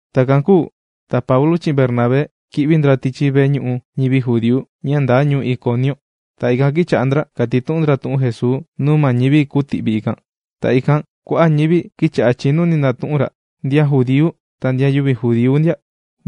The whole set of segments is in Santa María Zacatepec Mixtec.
Takan kūu ta Paulu chi'in Bernabé kī'vi ndra tichi veñu'u ñivi judíu ña ndaa ñuu Iconiu. Ta ikan kīcha'a kàtitu'un ndra tu'un Jesuu nuu ma ñivi kūtu'vi ikan. Ta ikan kua'a' ñivi kīcha'a chìnuni tu'un ra, ndian judíu ta ndian yüvi judíu ndia.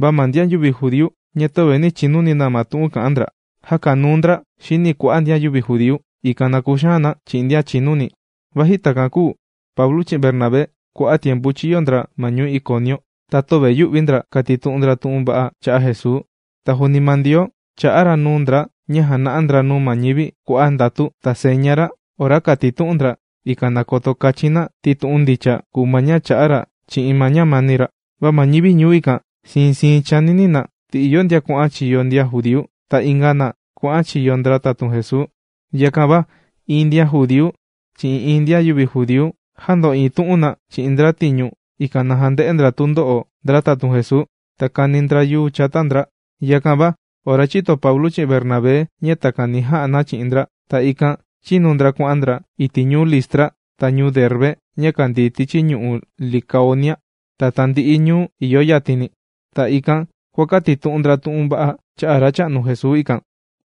Va ma ndian judíu ña töve nī chinuni ma tu'un kà'an ndra, jākanuu ndra xini kua'a' ndian yüvi judíu, ikan na kuxaan na chi'in ndian chìnuni. Vaji takan kūu, Paulu chi'in Bernabé kua'a' tiempu chīyo ndra ma ñuu Iconiu, ta töve yù'vi ndra kàtitu'un ndra tu'un va'a cha'a' Jesuu. Ta juuni ma Ndioo chà'a ra nuu ndra ña jàna'a ndra nuu ma ñivi kua'a' ndatu ta seña ra ora kàtitu'un ndra, ikan na koto kachin na ti tu'un ndicha kùu ma ña chà'a ra chi'in ma ñamani ra. Va ma ñivi ñuu ikan siin siin chànini na. Ti ìyo ndian kuà'an chiyo ndian judíu, ta inga na kuà'an chiyo ndra tatun Jesuu. Yakan va iin ndian judíu chi'in iin ndian yüvi judíu jāndo'iin tu'un na chi'in ndra tiñu, ikan na jande'e ndra tundo'o ndra tatun Jesuu, ta kani ndra yuu chata ndra. Yakan va ora chīto Paulu chi'in Bernabé ña takan ni ja'a na chi'in ndra, ta ikan chīnu ndra kuà'an ndra iti' ñuu Listra ta ñuu Derbe ña kàndii tichi ñu'u' Licaonia ta tandi'i ñuu ìyo yatini. Ta ikan kuàkatitu'un ndra tu'un va'a cha'a' Racha'nu Jesuu ikan.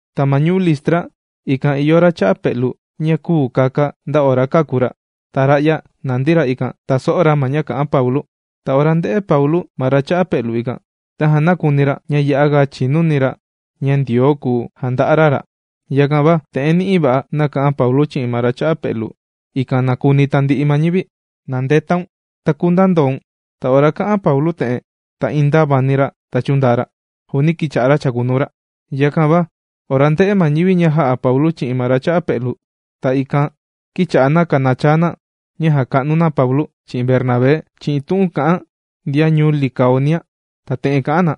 Ta ma ñuu Listra ikan ìyo ra cha'a pe'lu ña küu kaka nda ora kāku ra. Ta ra'ya nàndi ra ikan tàso'o ra ma ña kà'an Paulu. Ta ora ndē'e Paulu ma ra cha'a pe'lu ikan, tajan nākuni ra ña ya'a ga chìnuni ra ña Ndioo kùu janda'a ra ra. Yakan va te'en ni'i va'a nāka'an Paulu chi'in ma ra cha'a pe'lu, ikan na kuni tandi'i ma ñivi: ―¡Na ndetaun ta kundaa ndoun! Ta ora kā'an Paulu te'en ta iin ndāvani ra ta chūndaa ra, juuni kīcha'a chàkunuu ra. Yakan va ora ndē'e ma ñivi ña jā'a Paulu chi'in ma ra cha'a pe'lu, ta ikan kīcha'a na kànachaa na ña jàka'nu na Paulu chi'in Bernabé chi'in tu'un kà'an ndian ñuu Licaonia, ta te'en kà'an na: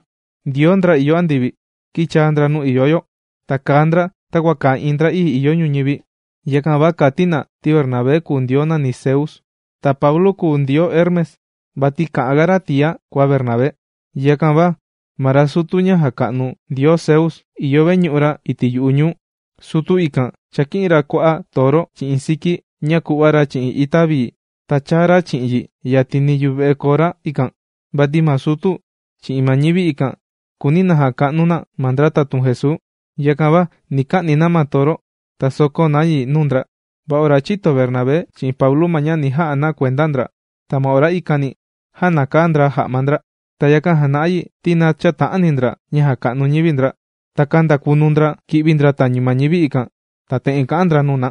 ―Ndioo ndra ìyo andivi, kīchaa ndra nuu ìyo yo. Ta kàa ndra takua kàa iin ndra'ii ìyo ñuñivi. Yakan va kàti na ti Bernabé kùu ndioo nàni Zeus, ta Paulu kùu ndioo Hermes, vati kà'an ga ra tia kua Bernabé. Yakan va ma ra sutu ña jàka'nu ndioo Zeus ìyo veñu'u ra iti' yu'u ñuu. Sutu ikan chāki'in ra kua'a' toro chi'in siki ña kùva'a chi'in ita vii ta chāa ra chi'in yi yatini yuve'e kora ikan. Vati ma sutu chi'in ma ñivi ikan kùuni na jaka'nu na ma ndra tatun Jesuu. Yakan va ni ka'ni na ma toro ta sokó na yi nuu ndra. Va ora chīto Bernabé chi'in Paulu ma ña ni ja'a na kuenda ndra, ta ma ora ikani jānakaa ndra ja'ma ndra, ta yakan jàna'a yi ti na chäta'ani ndra ña jàka'nu ñivi ndra. Ta kāndakunu ndra ki'vi ndra tañu ma ñivi ikan, ta te'en kà'an ndra nuu na: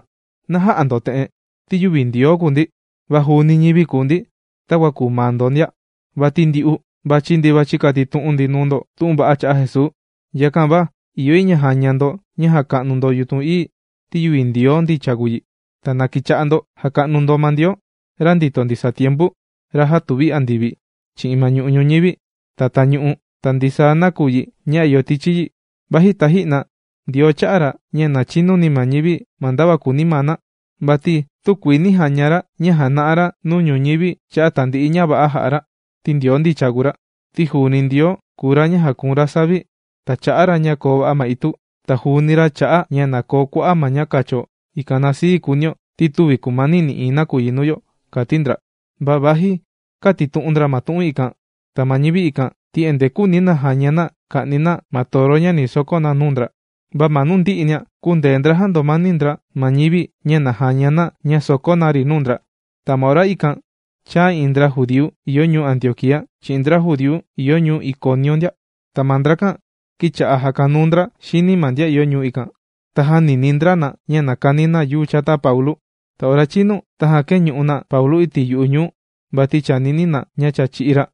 ―¡Na jä'a ndo te'en! Ti yüvi Ndioo kùu ndi, va juuni ñivi kùu ndi takua kùu maa ndo ndia. Vati ndyu'u, vàchi ndi vàchi katitu'un ndi nuu ndo tu'un va'a cha'a' Jesuu. Yakan va ìyo yi ña na jaña ndo ña jàka'nu yutun ií ti yüvi Ndioo ndicha kùu yi. Ta na kicha'a ndo jaka'nu ndo ma Ndioo, ra ndìto ndisaa tiempu, ra jātuvi andivi, chi'in ma ñu'u' ñuñivi, ta tañu'u ta ndisaa nakuyi ña ìyo tichi yi. Vaji taji'na Ndioo chā'a ra ña na chinuni ma ñivi ma ndava kùuni maa na, vati tükuii nī jaña ra ña jàna'a ra nuu ñuñivi cha'a' tandi'i ña va'a ña jà'a ra, ti Ndioo ndicha kùu ra. Ti juuni Ndioo kùu ra ña jàkuun ra savi, ta chà'a ra ña na koo va'a ma itu. Ta juuni ra chà'a ña na koo kua'a' ma ña kacho ikan na sii kùunio, ti tüvi kumani nï'iin nakuyi nuu yo ―kàti ndra. Va vaji kātitu'un ndra ma tu'un ikan, ta ma ñivi ikan, ti endee küuni na jaña na ña ka'ni na ma toro ña ni sokó na nuu ndra. Va ma nuu ndi'i nia kūndee ndra jàndomani ndra ma ñivi, ña na jaña na ña sòkó na ri nuu ndra. Ta ma ora ikan chāa iin ndra judíu ìyo ñuu Antioquía, chi'in ndra judíu ìyo ñuu Iconiu ndia. Ta ma ndrakan kīcha'a jàkanuu ndra xini ma ndian ìyo ñuu ikan, ta jānini ndra na ña na kani na yuu chata Paulu. Ta ora chīnu tajan kēñu'u na Paulu iti' yu'u ñuu vati chànini na ña cha chī'í ra.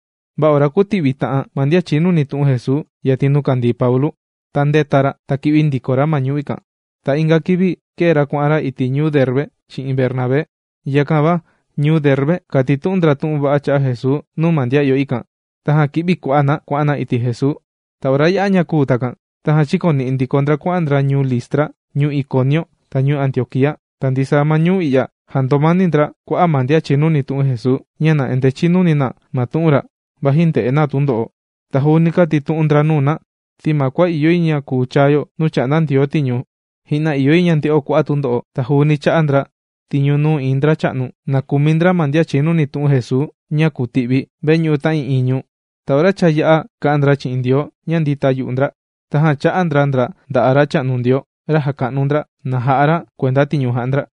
Va ora kūti'vita'an ma ndian chìnuni tu'un Jesuu yatin nuu kàndii Paulu, ta ndēta ra ta kī'vi ndiko ra ma ñuu ikan. Ta inga kivi kēe ra kuà'an ra iti' ñuu Derbe chi'in Bernabé. Yakan va ñuu Derbe, kàtitu'un ndra tu'un va'a cha'a' Jesuu nuu ma ndian ìyo ikan, tajan kī'vi kua'a' na kuà'an na iti' Jesuu. Ta ora yā'a ña'a kūu takan, tajan chīkoni'i ndiko ndra kuà'an ndra ñuu Listra, ñuu Iconiu, ta ñuu Antioquía. Ta ndisaa ma ñuu i'ya, jāndomani ndra kua'a' ma ndian chìnuni tu'un Jesuu, ña na endee chinuni na ma tu'un ra, vaji ndè'e na tundo'o. Ta juuni kāti ndra nuu na ti ma kua ìyo yi ña kuu chaa yo nuu chà'nda Ndioo tiñu, ji'na ìyo yi ña nde'o kua'a' tundo'o. Ta juuni chā'a ndra tiñu nuu iin ndracha'nu, na kumi ndra ma ndian chìnuni tu'un Jesuu ña kùti'vi veñu'u ta'ii'iin ñuu. Ta ora cha yā'a kà'an ndra chi'in Ndioo ña ndìta yu'u ndra, tajan chā'a ndra ndra nda'a' Racha'nu Ndioo, ra jàka'nu ndra, na ja'a ra kuenda tiñu jà'a ndra.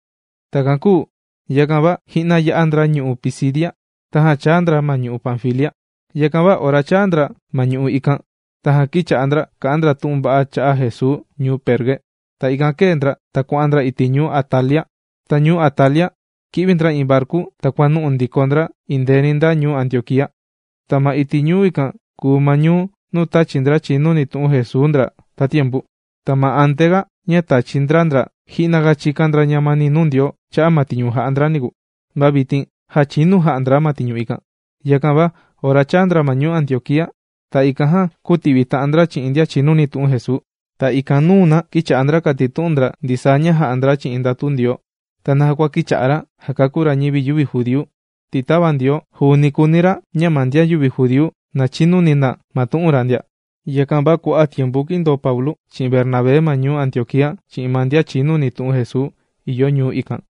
Takan kūu yakan va ji'na yā'a ndra ñu'u' Pisidia, tajan chāa ndra ma ñu'u' Panfilia. Yakan va ora chāa ndra ma ñu'u' ikan, tajan kīcha'a ndra kà'an ndra tu'un va'a cha'a' Jesuu ñuu Perge. Ta ikan kēe ndra ta kuà'an ndra iti' ñuu Atalia. Ta ñuu Atalia, kī'vi ndra iin varku ta kuànu'u ndiko ndra endeeni nda ñuu Antioquía. Ta ma iti' ñuu ikan kùu ma ñuu nuu tāchi ndra chìnuni tu'un Jesuu ndra tatiempu. Ta ma antea ña tāchi ndra ndra ji'na ga chīkan ndra ñamani nuu Ndioo cha'a' ma tiñu ni ja'a ndra niku. Ta vitin já chinu jā'a ndra ma tiñu ikan. Yakan va ora chāa ndra ma ñuu Antioquía, ta ikan jan kūti'vita'an ndra chi'in ndian chìnuni tu'un Jesuu. Ta ikan nùna kīcha'a ndra kàtitu'un ndra ndisaa ña jā'a ndra chi'in ndatu Ndioo, ta naja kua kīcha'a ra jàkakú ra ñivi yüvi judíu, ti tava Ndioo, juuni kùuni ra ña ma ndian yüvi judíu na chinuni na ma tu'un ra ndia. Yakan va kua'a' tiempu kīndoo Paulu chi'in Bernabé ma ñuu Antioquía chi'in ma ndian chìnuni tu'un Jesuu ìyo ñuu ikan.